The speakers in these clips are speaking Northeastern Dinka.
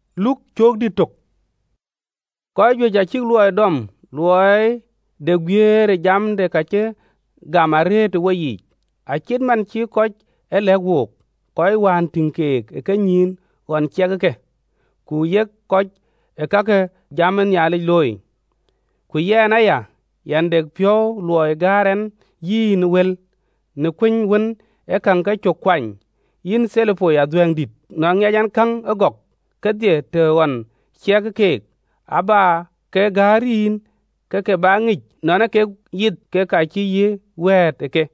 Adhuɛ̈ŋdït Theopilo: Kɔc juëc acïk luɔɔi dɔm, luɔɔi de guiëër ë jam de ka cï gam arëët ë woyiic. Acït man cï kɔc ë lɛ̈k wook, kɔc wään tïŋ keek ë kenyïïn ɣɔn ciɛkë ke, ku yek kɔc ë ka ke jam ë Nhialic looi. Ku yɛn aya, yɛn de piɔ̈u luɔɔi gäär ɛn yïn wël, në kuëny wën ee käŋ kecök kuany, yïn Theopilo adhuɛ̈ŋdït, nɔn ŋiɛc ɛn käŋ ëgɔk kedhie të ɣɔn ciɛk ë keek. Abä ke gäär yïn, ke ke bä ŋic nɔn ee kek yith kek ka cï yï wɛ̈ɛ̈t ë ke.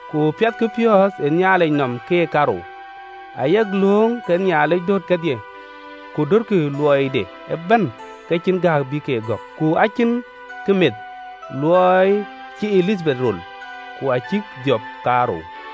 Ku piɛthkï piɔ̈ɔ̈th ë Nhialic nɔm keek kaarou, ayek lööŋ ke Bɛ̈nydït döt kedhie, ku dötkï luɔɔide ëbɛ̈n ke cïn gääk bï ke gɔ̈k. Ku acïnkï meth, në luɔɔi cï Elithabeth rol, ku acïk dhiɔp kaarou.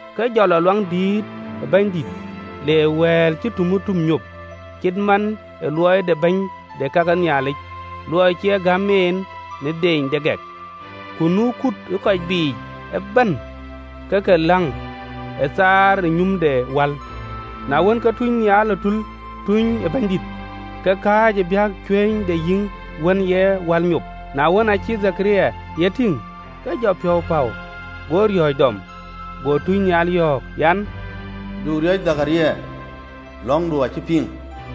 Ke jɔ lɔ Luaŋdït le wal ŋïr nyop, cït man ë luɔɔi de bɛ̈ny de ka ke Nhialic, luɔɔi cï gäm en në deeny de gɛk. Ku nu kut ë kɔc biic ëbɛ̈n ke ke läŋ ë thaar ë nyum de wal ŋïr. Na wën, ke tunynhial ë Bɛ̈nydït ë tul, ke kääc ë biäk cuëny de yïïŋ de nyum ë wal ŋïr. Na wën, aacï Dhekaria ye tïŋ, ke jɔ piɔ̈u päu, go riɔ̈ɔ̈c dɔm. Go tunynhial yɔ̈ɔ̈k an, “Du riɔ̈c, Dhekaria, lɔ̈ŋdu acï piŋ.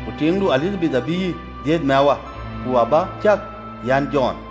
Ku tiiŋdu Elithabeth abï yï dhiëth mɛwä, ku abä cäk an, Jɔn.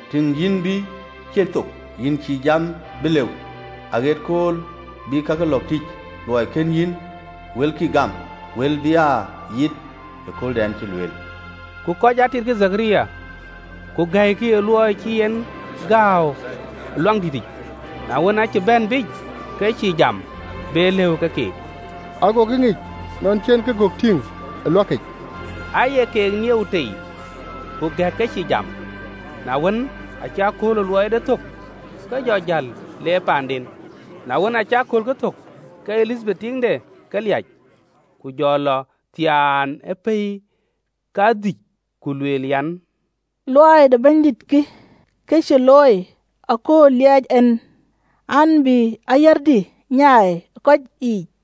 Tïŋ, yïn bï ciën thok, yïn cïï jam bï lëu, aɣët kööl bï kakë lɔ̈ɔ̈k tïc, luɔɔi kën yïn wëlkï gam, wël bï aa yith ëkööldɛn cï lueel.” Ku kɔc atitkï Dhekaria, ku gɛ̈ikï ë luɔɔi cï en gääu Luaŋdït. Na wën, aacï bɛ̈n biic, ke cïï jam be lëu ke keek: agokï ŋic nɔn cï en nyuuth tïŋ Luaŋdït, aye keek nieu tei, ku gɛ̈ɛ̈k ke cïï jam. Na wën, aacï kööl ke luɔɔide thök ë Luaŋdïtic, ke jɔ jäl le paanden. Na wën, acï aköölkë thök, ke Elithabeth tiiŋde ke liac, ku jɔ lɔ thiaan ë pɛ̈i kadhïc, ku lueel an, “Luɔɔi de Bɛ̈nydït kï, ke cï looi ëkööl lieec en ɛn, bï ayärdï nyaai ë kɔc yiic!”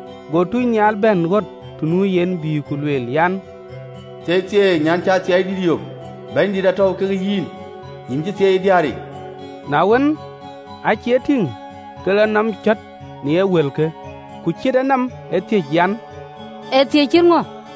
Go tunynhial bɛ̈n ɣöt të nu yen, bï ku lueel an, “Thieithieei, nyan cï athiɛɛidït yök, Bɛ̈nydït atɔ̈u ke yïn! Yïn cï thieei ë diäär yiic!” Na wën, acï e tïŋ, ke lɔ nɔm cɔ̈t në wëlkë, ku ciët enɔm ë thiëc an, ee thiëc cït ŋö?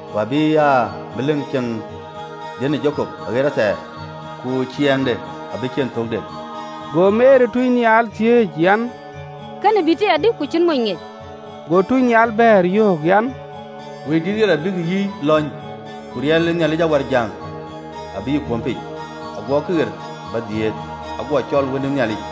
Ku abï aa melik ceŋ dhiën ë Jakop aɣet athɛɛr, ku ciɛɛŋde abï ciën thökde!” Go Meri tunynhial thiëëc an, “Kënë bï tïc adï, ku cïn mony ŋiɛc?” Go tunynhial bɛ̈ɛ̈r, yöök an, “Wëidït ɣer abïk yï lɔ̈ny, ku riɛl ë Nhialic Awärjäŋ abï yï kuöm piny: ago këɣeer bä dhiëëth ago cɔl Wën ë Nhialic.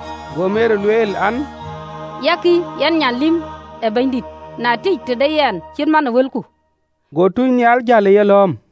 Go Meri lueel an, “Yakï yɛn nyan lïm ë Bɛ̈nydït, në tiëc tëde yɛn cït man ë wëlku.” Go tunynhial jäl ë yelɔ̈ɔ̈m.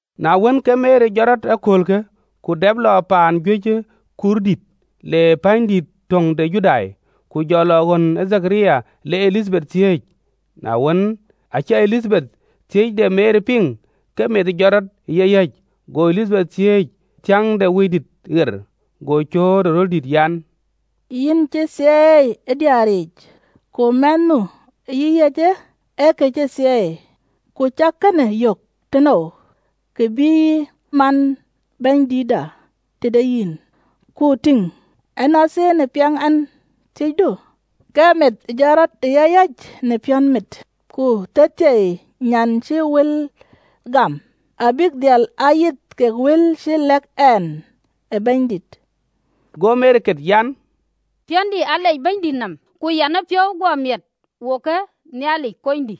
Na wën, ke Meri jɔt rɔt ë aköölkë, ku dɛp lɔ piny ë kuur, lee pänydïït töŋ de Juda. Ku jɔ lɔ ɣön ë Dhekaria, le Elithabeth thiëëc. Na wën, aacï Elithabeth thiëc de Meri piŋ, ke meth jɔt rɔt ë yeyäc, go Elithabeth thiäŋ ke Wëidït ɣer: Go cööt ë röldït an, “Yïn cï thieei ë diäär yiic, ku mɛnh nu ë yïyäcë ee kë cï thieei! Ku cä kënë yök tënou, kë bïï man Bɛ̈nydiëndït tëde yɛn? Ku tïŋ, ënɔnthiin ë piɛŋ ɛn thiëcdu, ke meth jɔt rɔt ë yayäc në piɔ̈nmit. Ku thieithieei nyan cï wël gam: abïk dhil aa yith kek wël cï lɛ̈k en ë Bɛ̈nydït!” Go Meri ket an, “Piɔ̈ndï alec Bɛ̈nydït nɔm, Ku yɛn ë piɔ̈u guɔ miɛt wokë Nhialic Konydï.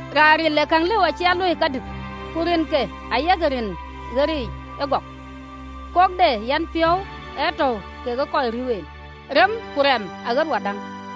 Raan ril ee käŋ lëu acï a luöi kadït, ku rinke ayek rin ɣeric ëgɔk. Kok de yenpiɔ̈u ee tɔ̈u kekë kɔc riëëu en, Remë ku remë aɣët wadäŋ.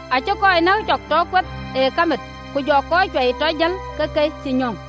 Acï kɔc nɛ̈k cɔk tɔ kueth ë kamit, Ku jɔ kɔc cuai tɔ jël ke ke dak.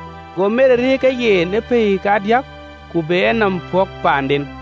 Go Meri rëër kekë yen ë pɛ̈i kadiäk, ku be enɔm pɔ̈k paanden.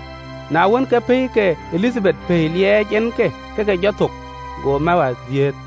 Na wën, ke pɛ̈i ke Elithabeth pɛɛi liɛɛc en ke ke ke jɔ thök, go mɛwä dhiëëth.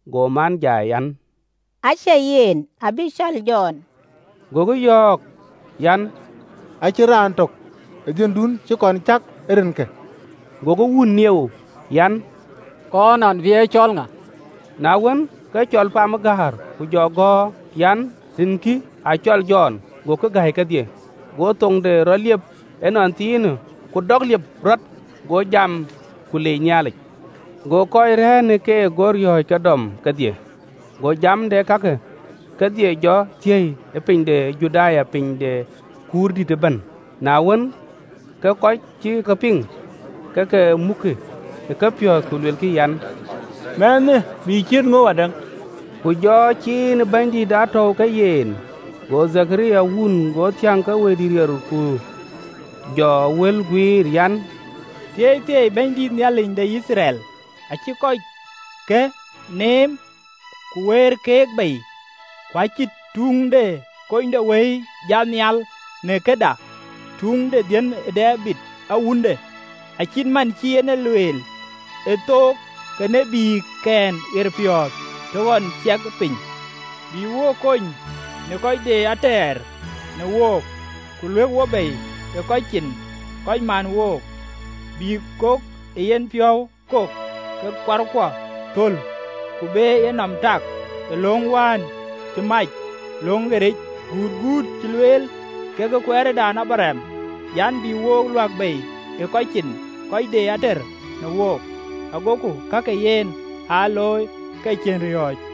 Go man jai an, “Acie yen abï cɔl Jɔn.” Gokï yɔ̈ɔ̈k an, “Acïn raan tök dhiëndun cï kɔn cäk ë rinkë!” Gokï wun nieu an, kɔɔr nɔn bï ye cɔl ŋa? Na wën, ke cɔl pam ë gäär ku jɔ gɔ̈ɔ̈r an, “Rinke acɔl Jɔn.” Gokï gäi kedhie! Go thoŋde rɔt liep ënɔnthiinë, ku däk liep rɔt, go jam, ku leec Nhialic. Go kɔc rɛ̈ɛ̈r në keek go riɔ̈ɔ̈c ke dɔm kedhie: go jam de kakë kedhie jɔ thiɛ̈i ë piny ë kuur Juda ëbɛ̈n. Na wën, ke kɔc cï ke piŋ, ke ke mukkï ë kepiɔ̈ɔ̈th, ku luelkï an, “Mɛnhë bï ciët ŋö wadäŋ?” Ku jɔ ciin ë Bɛ̈nydït aa tɔ̈u ke yen. Go Dhekaria wun go thiäŋ ke Wëidït ɣer, ku jɔ wël guiir an: “Thieithieei Bɛ̈nydït, Nhialic de Yithriɛl, acï kɔcke neem ku wëër keek bei, Ku acï tuŋ de kunydewëi jat nhial në këda, Tuŋ de dhiën ë Debid awunde, (Acït man cï en e lueel ë thok ke tït ke Nhialickɛn ɣeriic të ɣɔn ciɛkë piny), Bï wo kony në kɔc de ater në wook, ku luɛ̈k wo bei ë kɔc cin kɔc man wook, Bï kok ee yen piɔ̈u kok ke kuarkuɔ thöl, Ku be yenɔm tak në löŋ wään cï mac löŋ ɣeric, Gutguut cï lueel kekë kuɛɛrëdan Abraɣam, an, “Bï wo luäk bei ë kɔc cin kɔc de ater në wook. Agoku ka ke yen aa looi ke cïn riɔ̈ɔ̈c,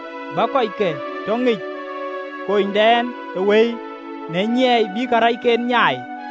Bä kɔcke tɔ ŋic kunydɛn ë wëi. Në nyiɛɛi bï karɛcken nyaai,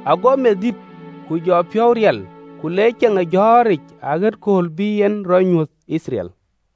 Ago meth dït, ku jɔ piɔ̈u riɛl, ku le ceŋ ë jɔ̈ɔ̈ric aɣët kööl bï en rɔ nyuöth Yithriɛl.